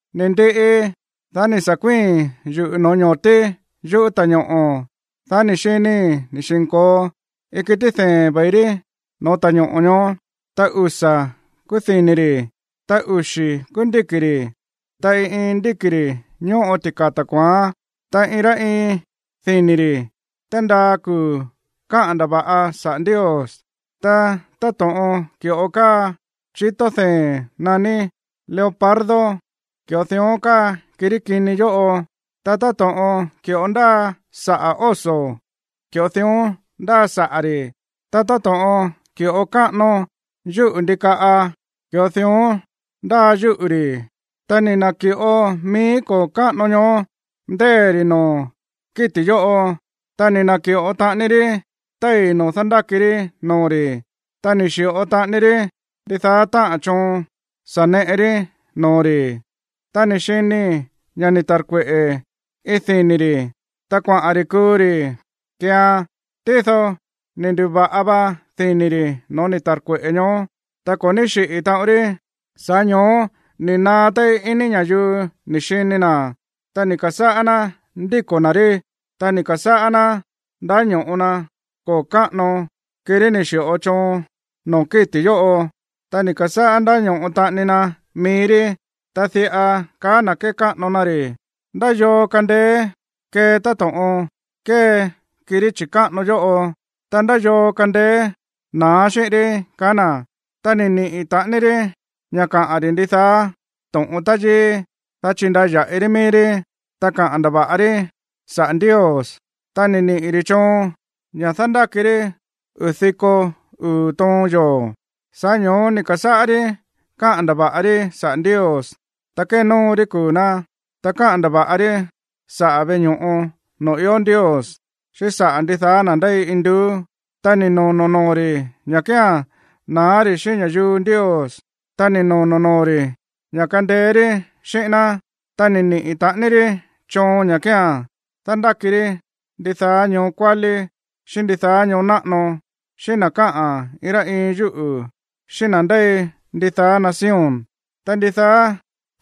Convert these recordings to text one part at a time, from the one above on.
Ni̱ ndiꞌi, dá ni̱ sa̱ kuíi̱n yuꞌu̱ no̱ó ño̱tí yuꞌú ta̱ñoꞌo̱, dá ni̱ xinii̱ ni̱ xi̱nko̱o iin kití dee̱n ve̱i rí no̱ó ta̱ñoꞌo̱ ñoó. Ta usa̱ kúú dini̱ ri̱, ta uxi̱ kúú ndíki̱ ri̱, ta iin iin ndíki̱ ri̱ ñóꞌo tika̱ta̱ kua̱án, ta iin rá iin dini̱ ri̱ tándaa kuu̱ káꞌa̱n ndava̱ꞌa saꞌa̱ Ndios. Ta táto̱ꞌon ki̱ꞌo káa chitó dee̱n naní leopardo, ki̱ꞌo dión káa kirí kini yóꞌo. Ta táto̱ꞌon ki̱ꞌo ndáa saꞌa̱ oso, ki̱ꞌo dión ndáa saꞌa̱ ri̱. Ta táto̱ꞌon ki̱ꞌo káꞌano yúꞌu̱ ndikaꞌa, ki̱ꞌo dión ndáa yúꞌu̱ ri̱. Ta ni̱ na̱ki̱ꞌo mií koo̱ káꞌano ñoó ndée̱ ri̱ noo̱ kíti̱ yóꞌo, ta ni̱ na̱ki̱ꞌo taꞌani rí téi̱ noo̱ dándáki rí noo̱ ri̱, ta ni̱ xi̱ꞌo taꞌani rí ndidaá táꞌa̱n choon sa̱ neꞌe rí noo̱ ri̱. Ta ni̱ xinii̱ ña̱ ni̱ ta̱rkueꞌe̱ iin dini̱ ri̱, ta kuaꞌa̱n ri̱ kuu ri̱ keean. Tído ni̱ ndu̱va̱ꞌa va dini̱ ri̱ no̱ó ni̱ ta̱rkueꞌe̱ ñoó, ta ko̱ ní xiꞌi̱ taꞌon rí. Sa̱ꞌá ño̱ó ni̱ naá téí ini ña̱yuu ni̱ xini na̱, ta ni̱ ka̱sáꞌá ná ndíko̱ na̱ rí. Ta ni̱ ka̱sáꞌá ná ndáño̱ꞌo na koo̱ káꞌano, kirí ni̱ xi̱ꞌo choon noo̱ kíti̱ yóꞌo, ta ni̱ ka̱sáꞌá ndáño̱ꞌo taꞌani na mií rí, ta diꞌa kaá na̱ kékáꞌano na ri̱: ―¿Ndá yoo kándéé kée táto̱ꞌon kée kirí chi̱káꞌano yóꞌo? Ta, ¿ndá yoo kandeé na̱á xíꞌín rí? ―kaá na̱. Ta ni̱ niꞌi̱ taꞌani rí ña̱ kaꞌa̱n ri̱ ndidaá to̱ꞌon táyíí, dá chindaya̱ꞌi rí mií rí, ta kaꞌa̱n ndava̱ꞌa rí saꞌa̱ Ndios. Ta ni̱ niꞌi̱ ri̱ choon ña̱ dándáki rí uu̱ diko uu̱ toon yoo̱. Sa̱ꞌá ño̱ó ni̱ ka̱sáꞌá rí káꞌa̱n ndava̱ꞌa rí saꞌa̱ Ndios, ta kénóo rí kuu̱ ná, ta káꞌa̱n ndava̱ꞌa rí saꞌa̱ veꞌe ño̱ꞌo noo̱ ió Ndios, xíꞌín saꞌa̱ ndidaá na̱ ndéi induú. Ta ni̱ nono̱ noo̱ ri̱ ña̱ kía̱n na̱á ri̱ xíꞌín ña̱yuu Ndios, ta ni̱ nono̱ noo̱ ri̱ ña̱ kandeé rí xíꞌín ná. Ta ni̱ niꞌi̱ taꞌani rí choon ña̱ kía̱n dándáki rí ndidaá ñoo kuálí, xíꞌín ndidaá ñoo náꞌano, xíꞌín na̱ káꞌa̱n iin rá iin yúꞌu̱, xíꞌín na̱ ndéi ndidaá nación. Ta ndidaá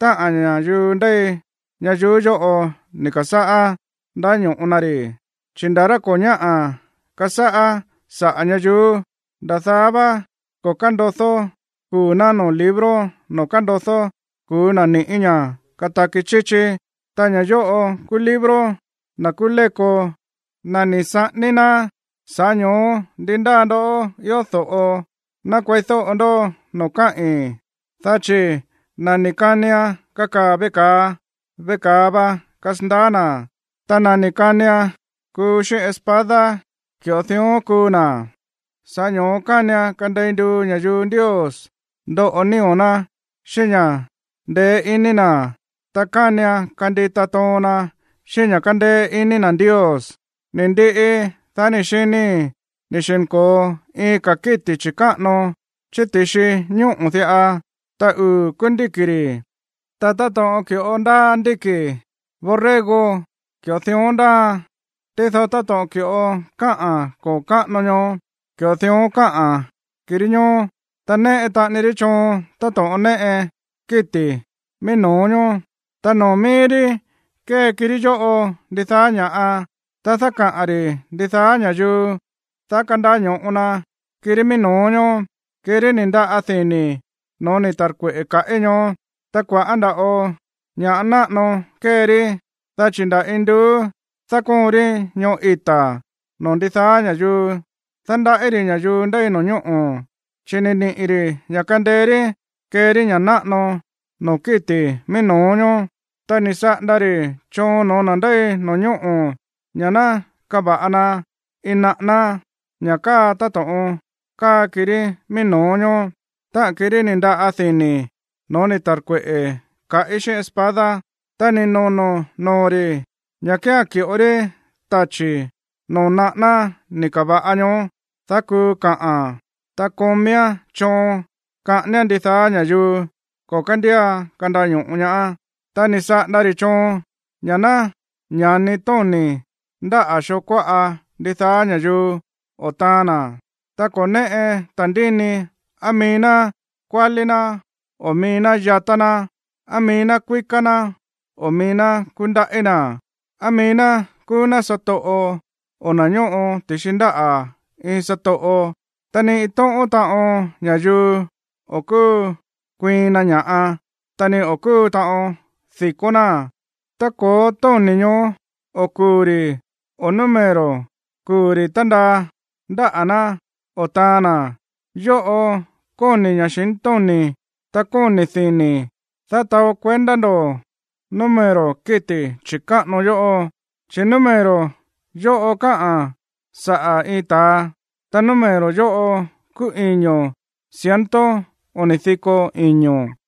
táꞌa̱n ña̱yuu ndéi ñayuú yóꞌo ni̱ ka̱sáꞌá ndáño̱ꞌo na ri̱, chi̱ nda̱ rá ko̱ ñáꞌa̱ kasáꞌá saꞌa̱ ñayuú, nda̱ daá vá ko̱ kándodó kuu̱ ná noo̱ libro noo̱ kándodó kuu̱ na̱ ni̱ꞌí ña̱ kataki chíchí. Ta ña̱ yóꞌo kúú libro na̱ kúú léko, na̱ ni̱ saꞌání ná. Sa̱ꞌá ño̱ó ndi ndáa ndoꞌó ió do̱ꞌo, ná kueídóꞌo ndó noo̱ káꞌi̱n. Dá chi̱ na̱ ni̱ kanian kakaa̱ veꞌe ka̱a, veꞌe ka̱a va kasandaá na̱, ta na̱ ni̱ kanian kuu xíꞌín espada, ki̱ꞌo dión kuu na̱. Sa̱ꞌá ño̱ó kánian kandei nduu ña̱yuu Ndios ndoꞌo nío̱ ná xíꞌín ña̱ ndeé iní na̱, ta kánian kandita toon na xíꞌín ña̱ kándéé iní na̱ Ndios. Ni̱ ndiꞌi, dá ni̱ xinii̱ ni̱ xi̱nko̱o iin ka̱ kíti̱ chi̱káꞌano chí ti̱xi ñóꞌo̱ diꞌa, ta uu̱ kúú ndíki̱ ri̱, ta táto̱ꞌon ki̱ꞌo ndáa ndíki̱ borrego, ki̱ꞌo dión ndáaan. Tído táto̱ꞌon ki̱ꞌo káꞌa̱n koo̱ káꞌano ñoó, ki̱ꞌo dión káꞌa̱n kirí ñoó. Ta néꞌe taꞌani rí choon táto̱ꞌon néꞌe kíti̱ mií no̱ó ñoó, ta noo̱ mií rí kée kirí yóꞌo ndidaá ña̱ꞌa. Ta dákaꞌa̱n ri̱ ndidaá ña̱yuu, dá kandaño̱ꞌo na kirí mií no̱ó ñoó, kirí ni̱ ndaꞌa dini̱ no̱ó ni̱ ta̱rkueꞌe̱ kaꞌí ñoó. Ta kua̱ꞌá nda̱ꞌo ña̱ꞌa náꞌano kée ri, dá chi̱ nda̱ induú dákóon rí ñoꞌó ita̱ noo̱ ndidaá ña̱yuu. Dándaꞌí ri̱ ña̱yuu ndéi no̱ñóꞌo̱, chi̱ ni̱ niꞌi̱ ri̱ ña̱ kandeé rí kee rí ña̱ náꞌano noo̱ kíti̱ mií no̱ó ñoó. Ta ni̱ saꞌanda ri̱ choon no̱ó na̱ ndéi no̱ñóꞌo̱ ña̱ ná kava̱ꞌa na iin naꞌáná, ña̱ káa táto̱ꞌon káa kirí mií no̱ó ñoó, táꞌa̱n kirí ni̱ ndaꞌa dini̱ no̱ó ni̱ ta̱rkueꞌe̱ kaꞌí xíꞌín espada. Ta ni̱ nono̱ noo̱ ri̱ ña̱ kía̱n ki̱ꞌo rí tachi̱ noo̱ naꞌáná ni̱ ka̱va̱ꞌa ñoó, dá kuu kaꞌa̱n. Ta kómíán choon kaꞌáníán ndidaá ña̱yuu ko̱ kándía kandaño̱ꞌo ñaá. Ta ni̱ saꞌanda ri̱ choon ña̱ ná ña̱ni tóni̱ ndáꞌa̱ xoo kuáꞌa ndidaá ña̱yuu o taan na̱, ta ko̱ néꞌe ta̱ndíni á mií ná kuálí ná o mií ná yatá ná, á mií ná kuíká ná o mií ná kúndaꞌí na̱, á mií ná kúú ná satoꞌo o na̱ ñóꞌo ti̱xi ndáꞌa̱ iin satoꞌo. Ta ni iin tóꞌón taꞌon ña̱yuu o̱ kúu kuiin na ña̱ꞌa, ta ni o̱ kúu taꞌon di̱kó náa̱n tá ko̱ó tóni̱ ñoó o kuu̱ ri̱ o número kuu̱ ri̱ tándaa ndáꞌa̱ ná o taan na̱. Yóꞌo kóni̱ ña̱xintóni̱, ta kóni̱ dini̱, dá taó kuendá ndo̱ número kíti̱ chi̱káꞌano yóꞌo, chi̱ número yóꞌo káꞌa̱n saꞌa̱ iin ta̱a, ta número yóꞌo kúú iño̱ ciento oni̱ diko iño̱.